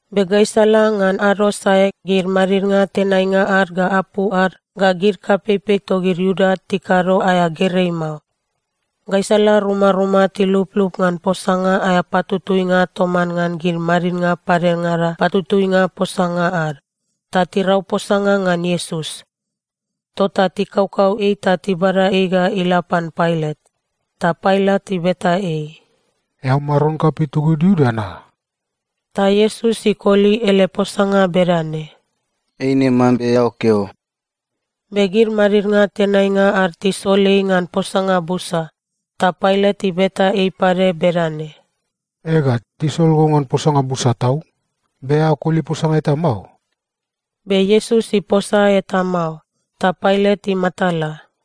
Be gaisala ngan ado sae gid madidnga tenainga ad ga apu ad ga gid kapeipei togid Iuda tikado aea gerei mao. Gaisala rumaruma tiluplup ngan posanga aea patutuinga toman ngan gid madidnga padengada patutuinga posanga ad, ta tirau posanga ngan Iesus. Tota tikaukau ei ta tibada ei ga ila pan Pailat. Ta Pailat ibeta ei, “Eao maron kapei togid Iuda na?” Ta Iesus ikoli ele posanga bedane, “Eine mambe eao keo.” Be gid madidnga tenainga ad tisol ei ngan posanga busa, ta Pailat ibeta ei pade bedane, “Ega, tisol go ngan posanga busa tau. Be eao koli posanga eta mao?” Be Iesus iposa eta mao, ta Pailat imatala.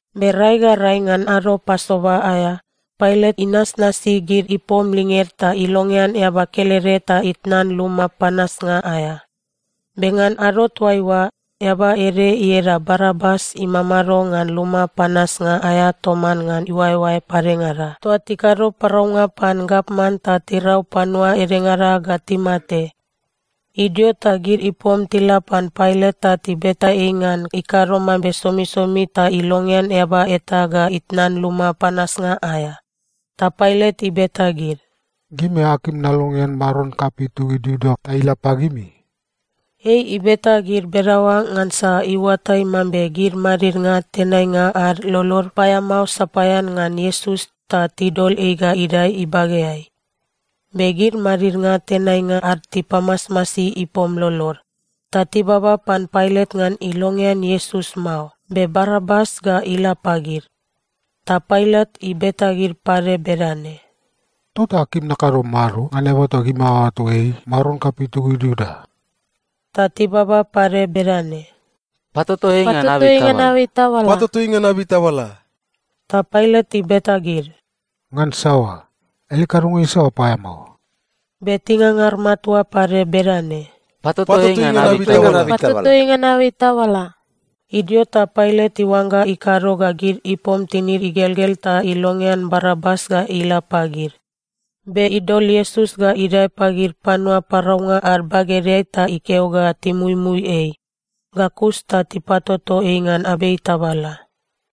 Be rai ga rai ngan ado Pasova aea, Pailat inasnasi gid ipom linged ta ilongean eaba kelede ta itnan luma panasnga aea. Be ngan ado toaiua, eaba ede ieda Barabas imamado ngan luma panasnga aea toman ngan iuaeoae padengada toa tikado paraunga pan gavman ta tirau panua edengada ga timate. Idio ta gid ipom tila pan Pailat ta tibeta ei ngan ikado mambe somisomi ta ilongean eaba eta ga itnan luma panasnga aea. Ta Pailat ibeta gid, “Gimi akim nalongean maron kapei togid Iuda ta ila pagimi?” Ei ibeta gid bedaoa ngansa iuatai mambe gid madidnga tenainga ad lolod paeamao sapaean ngan Iesus ta tidol ei ga idae ibageai. Be gid madidnga tenainga ad tipamasmasi ipom lolod, ta tibaba pan Pailat ngan ilongean Iesus mao, be Barabas ga ila pagid. Ta Pailat ibeta gid pade bedane, “Tota akim nakado mado ngan eaba toa gimi aoato ei maron kapei togid Iuda?” Ta tibaba pade bedane, “Patoto ei ngan abei tabala!” Ta Pailat ibeta gid, “Ngan saoa? Ele kadonga isaoa paeamao?” Be tingangar matua pade bedane, “Patoto ei ngan abei tabala!” Idio ta Pailat iuangga ikado ga gid ipom tinid igelgel ta ilongean Barabas ga ila pagid. Be idol Iesus ga idae pagid panua paraunga ad bagedeai ta ikeo ga timuimui ei, ga kus ta tipatoto ei ngan abei tabala.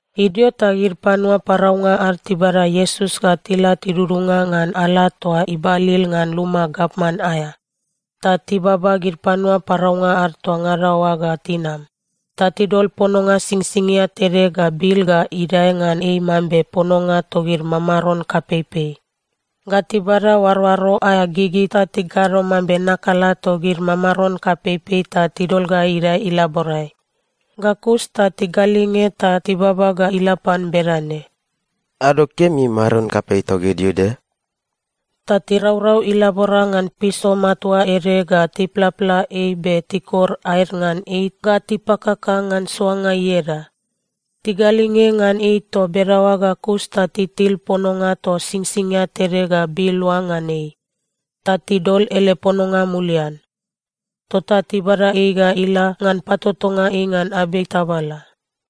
Idio ta gid panua paraunga ad tibada Iesus ga tila tidudunga ngan ala toa ibalil ngan luma gavman aea, ta tibaba gid panua paraunga ad toa ngada oa ga tinam. Ta tidol pononga singsingia tede ga bil ga idae ngan ei mambe pononga togid mamaron kapeipei, ga tibada oaroaro aea gigi ta tikado mambe nakala togid mamaron kapeipei ta tidol ga idae ilaborai. Ga kus ta tigalinge ta tibaba ga ila pan bedane, “Ado kemi, maron kapei togid Iuda!” Ta tiraurau ilabora ngan piso matua ede ga tiplapla ei be tikor aed ngan ei ga tipakaka ngan soanga ieda. Tigalinge ngan ei toa bedaoa ga kus ta titil pononga toa singsingia tede ga bil oa ngan ei, ta tidol ele pononga mulian. Tota tibada ei ga ila ngan patotonga ei ngan abei tabala.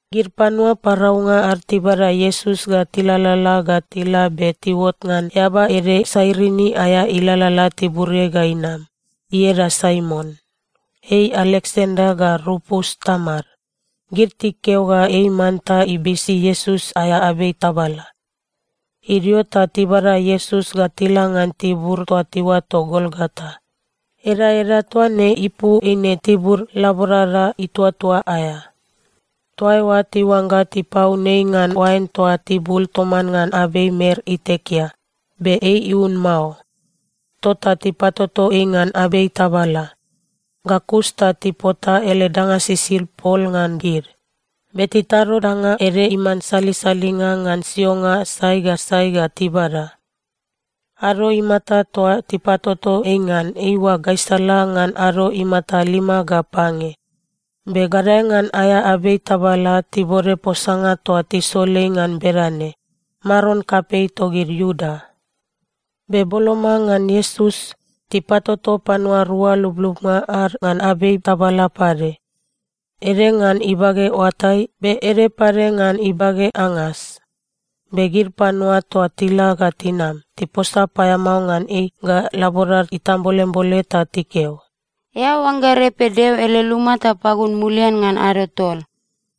Gid panua paraunga ad tibada Iesus ga tilalala ga tila be tiuot ngan eaba ede Sairini aea ilalala tiburiai ga inam, ieda Saimon. (Ei Aleksanda ga Rupus tamad.) Gid tikeo ga ei manta ibisi Iesus aea abei tabala. Idio ta tibada Iesus ga tila ngan tibur toa tiuato Golgota. Edaeda toa ne ipu eine Tibur Laborada Ituatua aea. Toa eoa tiuangga tipaun ei ngan oain toa tibul toman ngan abei mer itekea, be ei iun mao. Tota tipatoto ei ngan abei tabala. Ga kus ta tipota ele danga sisid pol ngan gid, be titado danga ede iman salisalinga ngan sionga sai ga sai ga tibada. Ado imata toa tipatoto ei ngan, eiua gaisala ngan ado imata lima ga pange. Be gadae ngan aea abei tabala tibode posanga toa tisol ei ngan bedane, “Maron kapei togid Iuda.” Be boloma ngan Iesus, tipatoto panua rua lublubnga ad ngan abei tabala pade, ede ngan ibage oatai, be ede pade ngan ibage angas. Be gid panua toa tila ga tinam, tiposa paeamao ngan ei ga laborad itambolembole ta tikeo, “Eao oangga repe Deo ele luma ta pagun mulian ngan ado tol?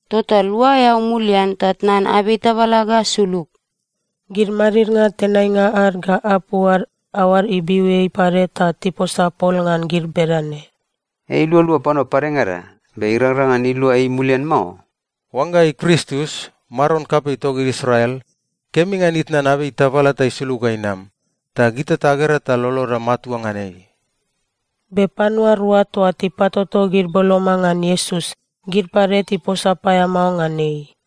Tota lua eao mulian ta tnan abei tabala ga sulug.” Gid madidnga tenainga ad ga apu ad aoad ibiu ei pade ta tiposa pol ngan gid bedane, “Ei ilualua panua padengada, be irangrang ngan ilua ei mulian mao. Oangga ei Kristus, maron kapei togid Israel, kemi ngan itnan abei tabala ta isulug ga inam, ta gita tagera ta loloda matua ngan ei.” Be panua rua toa tipatoto gid boloma ngan Iesus, gid pade tiposa paeamao ngan ei.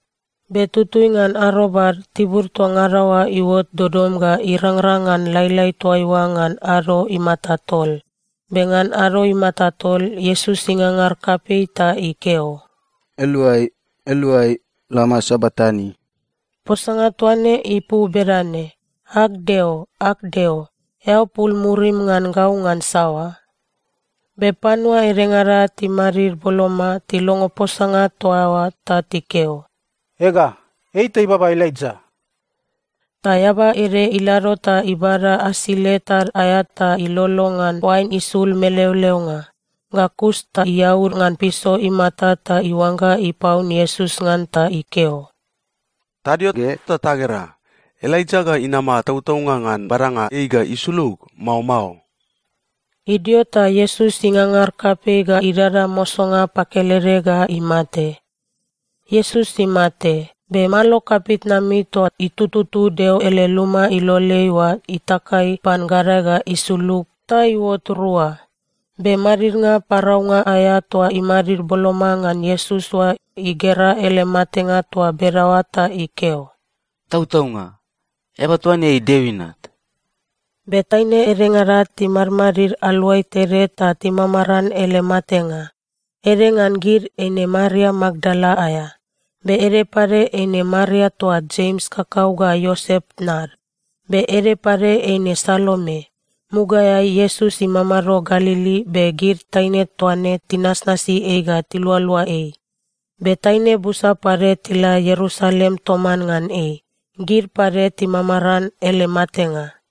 Be tutui ngan arobad, tibur toa ngada oa iuot dodom ga irangrang ngan lailai toaiua ngan ado imata tol. Be ngan ado imata tol Iesus ingangar kapei ta ikeo, “Eloi, Eloi, lama sabaktani!” Posanga toa ne ipu bedane, “Ag Deo, ag Deo, eao pul murim ngan gau ngan saoa?” Be panua edengada timadid boloma, tilongo posanga toa oa ta tikeo, “Ega, ei ta ibaba Elaija!” Ta eaba ede ilado ta ibada asile tad aea ta ilolo ngan oain isul meleoleonga. Ga kus ta iaud ngan piso imata ta iuangga ipaun Iesus ngan ta ikeo, “Tadio ge ta tagera. Elaija ga inama tautaunga ngan badanga ei ga isulug, mao mao?” Idio ta Iesus ingangar kapei ga idada mosonga pakelede ga imate. Iesus imate, be malo kapitnami toa itututu Deo ele luma iloleai oa itakai pan gadae ga isulug ta iuot rua. Be madidnga paraunga aea toa imadid boloma ngan Iesus oa igera ele matenga toa bedaoa ta ikeo, “Tautaunga, eaba toa ne ei Deo Inat!” Be taine edengada timadmadid aluai tede ta timamaran ele matenga. Ede ngan gid, eine Maria Makdala aea. Be ede pade eine Maria toa Jems kakau ga Iosep tnad. Be ede pade eine Salome. Mugaeai Iesus imamado Galili, be gid taine toa ne tinasnasi ei ga tilualua ei. Be taine busa pade tila Ierusalem toman ngan ei, gid pade timamaran ele matenga.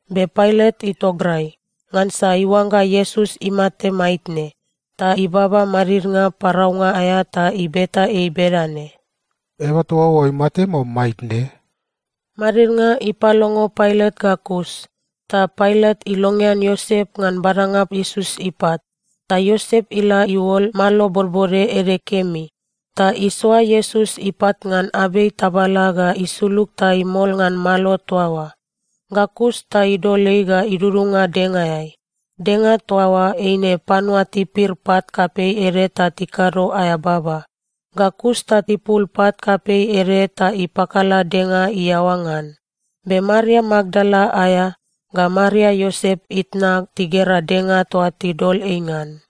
Be Pailat itograi, ngansa iuangga Iesus imate maitne, ta ibaba madidnga paraunga aea ta ibeta ei bedane, “Eaba toa oa imate, mao maitne?” Madidnga ipalongo Pailat ga kus, ta Pailat ilongean Iosep ngan badanga Iesus ipat. Ta Iosep ila iuol malo bodbode ede kemi. Ta isoa Iesus ipat ngan abei tabala ga isulug ta imol ngan malo toa oa. Ga kus ta idol ei ga idudunga dengaeai. Denga toa oa eine panua tipir pat kapei ede ta tikado aea baba. Ga kus ta ipul pat kapei ede ta ipakala denga iaoa ngan. Be Maria Makdala aea, ga Maria Iosep itna tigera denga toa tidol ei ngan.